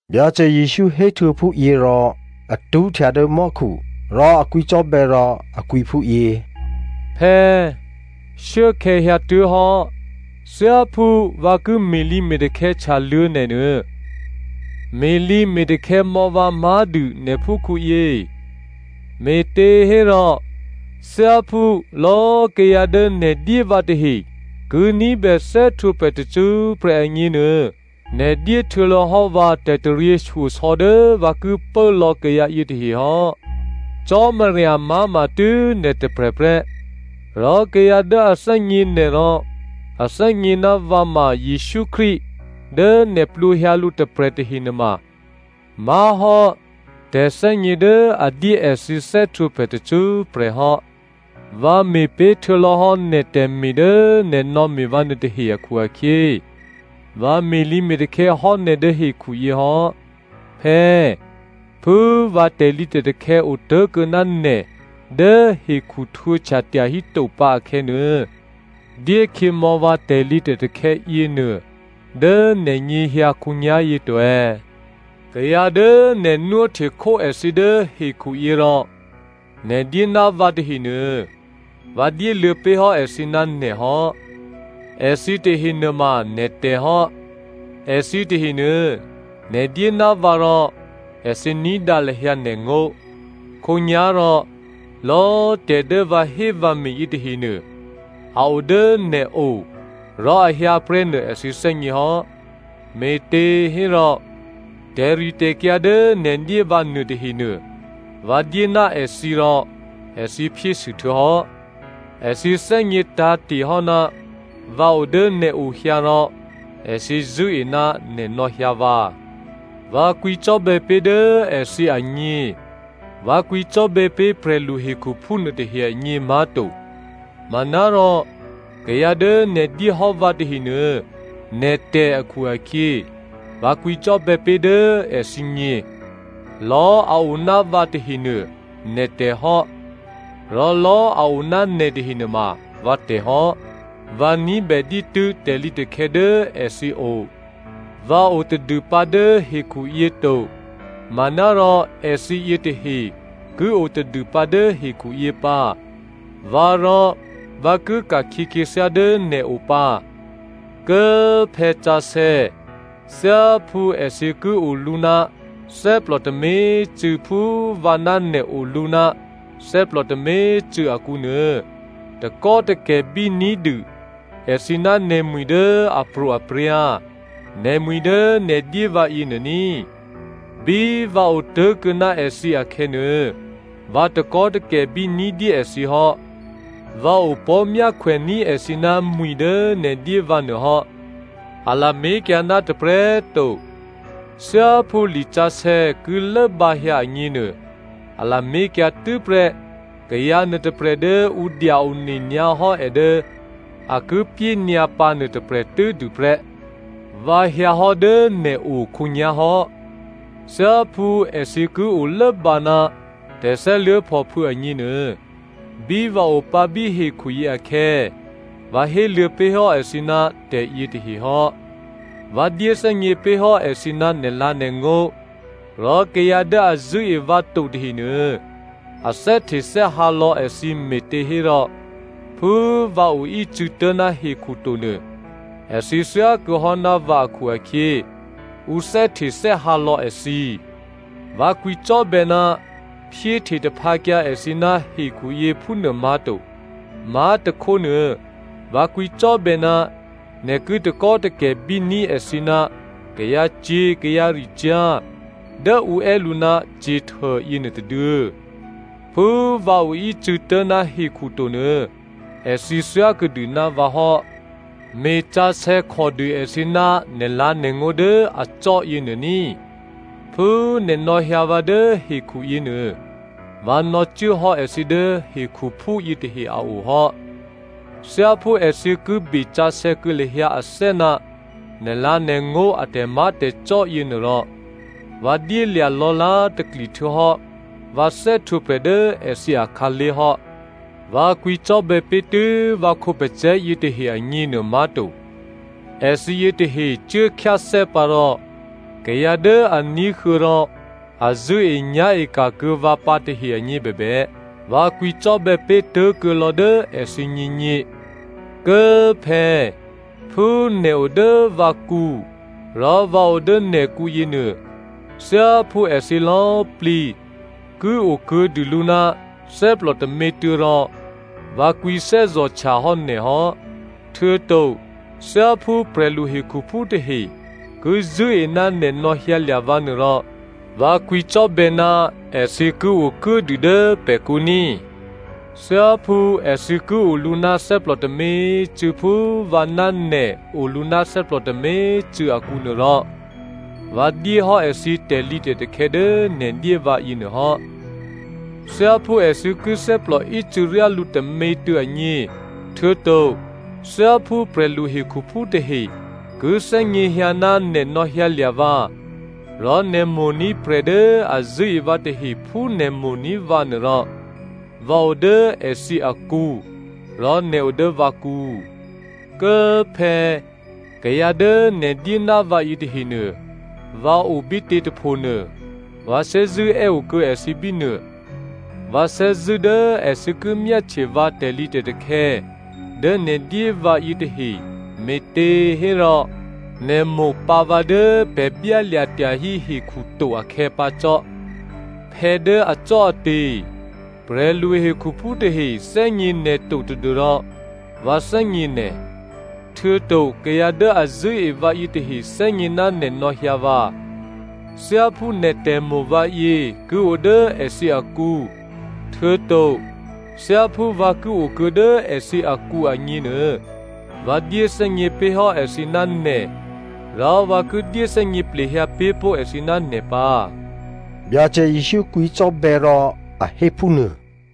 Byacè Jesǔ héhtuô̌ phúyě rò a tṳ́htya dố mò́khu rò a kwǐcò́bè̌ rò a kwǐ phúyě, “Phè̌꤮, shuốkhè̌ hyǎtuố̤hò́. Thyáphú vǎ ki me̤lǐme̤takhè̌ htyaluô̌ nè̤nuô, me̤lǐme̤takhè̌ mò̌ vǎ má̤dû nè̤ phúkhǔyě. Me̤těhérò thyáphú lò̌꤮ kayǎ dố nè̤ dyé vǎ tahe ki ní̤bè thè́htwǒprè̤ tacṳ́prè̤ agněnuô, nè̤ dyé htuô̌lò̌hò́ vǎ tè̤taryěshyosò̌ dố vǎ ki pố lò̌ kayǎ yětahe hò́. Cò́marya má̤ma tû́ nè̤ tôprè̤prè́, rò kayǎ dố a thè́gně nè̤ rò a thè́gně ná vǎ ma Jesǔ Krístu dố nè̤ plwǒhyǎ lǔ tôprè̤ tahe nuôma má̤hò́ tè̤thè́gně dố a dyé èthǐ thè́htwǒprè̤ tacṳ́prè̤ hò́. Vǎ me̤ pé̤ htuô̌lò̌ hò́ nè̤ tè̤me̤ dố nè̤ nò̌me̤ vǎ nuôtahe akhu-akhyě, vǎ me̤lǐme̤takhè̌ hò́ nè̤ dố hekhuyě hò́. Phè̌꤮, phú vǎ tè̤lǐtè̤takhè̌ otố̤kuô̌ ná nè̤ dố hekhu htwǒhtya tyahíto pǎ akhè̌nuô, dyékhyěmò̌ vǎ tè̤lǐtè̤takhè̌ yěnuô dố nè̤nyěhyǎ khǒnyá̤yě to.” “Kayǎ dố nè̤ nwóhtekhó èthǐ dố hekhuyě rò nè̤ dyé ná vǎ tahenuô vǎ dyéluô̌ pé̤hò́ èthǐ ná nè̤ hò́. Èthǐ tahe nuôma nè̤tè̤ hò́. Èthǐ tahenuô, nè̤ dyé ná vǎ rò èthǐ ní̤dǎ lahyǎ nè̤ngó̤. Khǒnyá̤rò lò̌꤮ tè̤ dố vǎhé vǎme̤ yětahenuô, a o dố nè̤o rò a hyǎ prè́nuô èthǐ thè́gně hò́. Me̤těhérò, tè̤ritè̤kyǎ dố nè̤ dyé vǎ nuôtahenuô, vǎ dyé ná èthǐ rò èthǐ phyésû htuô̌hò́. Èthǐ thè́gně tǎ̤te̤ hò́ ná vǎ o dố nè̤ o hyǎ rò èthǐ zṳ̂́e ná nè̤ nò̌hyǎ vǎ. Vǎ kwǐcò́bè̌ pé̤ dố èthǐ agně. Vǎ kwǐcò́bè̌ pé̤ prè̤lu hekhuphú nuôtahe agně má̤to. Manárò kayǎ dố nè̤ dyéhò́ vǎ tahenuô, nè̤tè̤ akhu-akhyě, vǎ kwǐcò́bè̌ pé̤ dố èthǐgně. Lò̌꤮ a o ná vǎ tahenuô, nè̤tè̤ hò́, rò lò̌꤮ a o ná nè̤ tahenuôma, vǎtè̤ hò́. Vǎ ní̤bè dǐtû́ tè̤lǐtakhè̌ dố èthǐ o. Vǎ o tadû pǎ dố hekhuyě to, manárò èthǐ yětahe ki o tadûpǎ dố hekhuyě pǎ. Vǎrò, vǎ ki ka̤khyě khyěthyá dố nè̤ o pǎ. Kố꤮ Phè̌ sǎsè̌! Thyáphú èthǐ ki olǔ ná thè́plò tômě꤮ cû̌ phú vǎ ná nè̤ olǔ ná thè́plò tômě꤮ cû̌ akǔnuô, takò́takè̤ bíní̤dû èthǐ ná nè̤mwi̤ dố apro̤aprya̤, nè̤mwi̤ dố nè̤ dyé vǎ yěnuô ní꤮. Bí vǎ otố̤kuô̌ ná èthǐ akhè̌nuô, vǎ takò́takè̤bí ní̤dyé èthǐ hò́, vǎ opò̤́ myákhwèní̤ èthǐ ná mwi̤ dố nè̤ dyé vǎ nuô hò́. A lamé̤kyǎ ná tôprè̤꤮ to. Thyáphú lisǎsè̌ ki lốbǎhyǎ agněnuô, a lamé̤kyǎ tû́prè́ kayǎ nuôtôprè̤ dố ǔ dya one nyǎhò́ è dố a ki pyényǎ pǎ nuôtôprè̤ tû́dû prè́.” “Vǎ hyǎhò́ dố nè̤ o khǒnyá̤ hò́. Thyáphú èthǐ ki olốbǎ ná tè̤thè́luố̤phòphû̌ agněnuô, bí vǎ opǎ bí hekhuyě akhè̌, vǎ héluô̌ pé̤ hò́ èthǐ ná tè̤yětahe hò́. Vǎ dyéthè́gně pé̤hò́ èthǐ ná nè̤lǎ̤nè̤ngó̤, rò kayǎ dố a zṳ̂́e vǎ to tahenuô, a thè́htethè́hǎ lò̌ èthǐ me̤těhérò phú vǎ oícû̌tố̤ ná hekhu to nuô, èthǐ thyákuô̌ hò́ ná vǎ akhu-akhyě, ǔ thè́htethè́hǎ lò̌ èthǐ. Vǎ kwǐcò́bè̌ ná phyéhte taphǎkyǎ èthǐ ná hekhuyě phúnuô má̤to. Má̤tôkhónuô, vǎ kwǐcò́bè̌ ná nè̤ ki takò́takè̤ bíní̤ èthǐ ná kayǎcyě̤ kayǎricyá̤ dố ǔ è́ lǔ ná Satan yěnuô tôduô̌. Phú vǎ oícû̌tố̤ ná hekhu to nuô, èthǐ thyákuô̌dû ná vǎ hò́. Me̤sǎsè̌ khòdû èthǐ ná nè̤lǎ̤nè̤ngó̤ dố acò́ yěnuô ní꤮. Phú nè̤ nò̌hyǎ vǎ dố hekhu yěnuô, vǎ nò̌cuốhò́ èthǐ dố hekhuphú yětahe a o hò́. Thyáphú èthǐ ki besǎsè̌ kuô̌ lahyǎ athè́ ná nè̤lǎ̤nè̤ngó̤ a tè̤má̤tè̤cò́ yěnuô rò, vǎ dyélya̤ lò̌lá̤takli htuô̌hò́ vǎ thè́htwǒprè̤ dố èthǐ akhǎlé̤ hò́.” “Vǎ kwǐcò́bè̌ pé̤ tû́ vǎ khǒpacè̤̌ yětahe agněnuô má̤to. Èthǐ yětahe cuố khyáthè́ pǎ rò kayǎ dố a ní̤huô̌ rò a zṳ̂́enyá̤e ka̤ kuô̌ vǎ pǎ tahe agněbèbè, vǎ kwǐcò́bè̌ pé̤ tố̤kuô̌ lò̌ dố èthǐgněgně. Kố꤮ phè̌, phú nè̤ o dố vǎkǔ, rò vǎ o dố nè̤kǔ yěnuô, thyáphú èthǐ lò̌꤮ plǐ ki okuô̌dû lǔ ná thè́plò tômětuô̌ rò, vǎ kwǐ thè́zò̤htya hò́ nè̤ hò́. Htuô̌to thyáphú prè̤lu hekhuphú tahe ki zṳ̂́e ná nè̤ nò̌hyǎlya̤ vǎ nuôrò, vǎ kwǐcò́bè̌ ná èthǐ ki okuốdû dố pè̤kǔ ní꤮. Thyáphú èthǐ ki olǔ ná thè́plò tômě꤮ cû̌ phú vǎ ná nè̤ olǔ ná thè́plò tômě꤮ cû̌ akǔnuô rò, vǎ dyé hò́ èthǐ tè̤lǐtè̤takhè̌ dố nè̤ dyé vǎ yěnuô hò́. Thyáphú èthǐ ki thè́plò ícû̌ryá lǔ tômětuô̌ agně, htuô̌to thyáphú prè̤lu hekhuphú tahe ki thè́gněhyǎ ná nè̤ nò̌hyǎlya̤ vǎ, rò nè̤ mo̤ní̤ prè̤ dố a zṳ̂́e vǎ tahe phú nè̤ mo̤ní̤ vǎ nuôrò, vǎ o dố èthǐ akǔ rò nè̤ o dố vǎkǔ.” “Kố꤮ Phè̌, kayǎ dố nè̤ dyé ná vǎ yětahenuô, vǎ o bítě tôphonuô, vǎ thè́zṳ̂́ è́ okuô̌ èthǐ bínuô. Vǎ thè́zṳ̂́ dố èthǐ ki myáhtye vǎ tè̤lǐtè̤takhè̌ dố nè̤ dyé vǎ yětahe, me̤těhérò, nè̤ mo̤ pǎ vǎ dố pè̤ byálya̤ tyahí hekhu to akhè̌ pǎ cò́.” “Phè̌ dố acò́ate̤꤮, prè̤lu hekhuphú tahe thè́gně nè̤ to tadû́rò vǎ thè́gně nè̤, htuô̌to kayǎ dố a zṳ̂́e vǎ yětahe thè́gně ná nè̤ nò̌hyǎ vǎ. Thyáphú nè̤ tè̤mo̤ vǎyě ki o dố èthǐ akǔ, htuô̌to thyáphú vǎ ki okuô̌ dố èthǐ akǔ agněnuô, vǎ dyéthè́gně pé̤hò́ èthǐ ná nè̤, rò vǎ ki dyéthè́gně plehyǎ pé̤ pó̤ èthǐ ná nè̤ pǎ,” Byacè Jesǔ kwǐcò́bè̌ rò a hé phúnuô.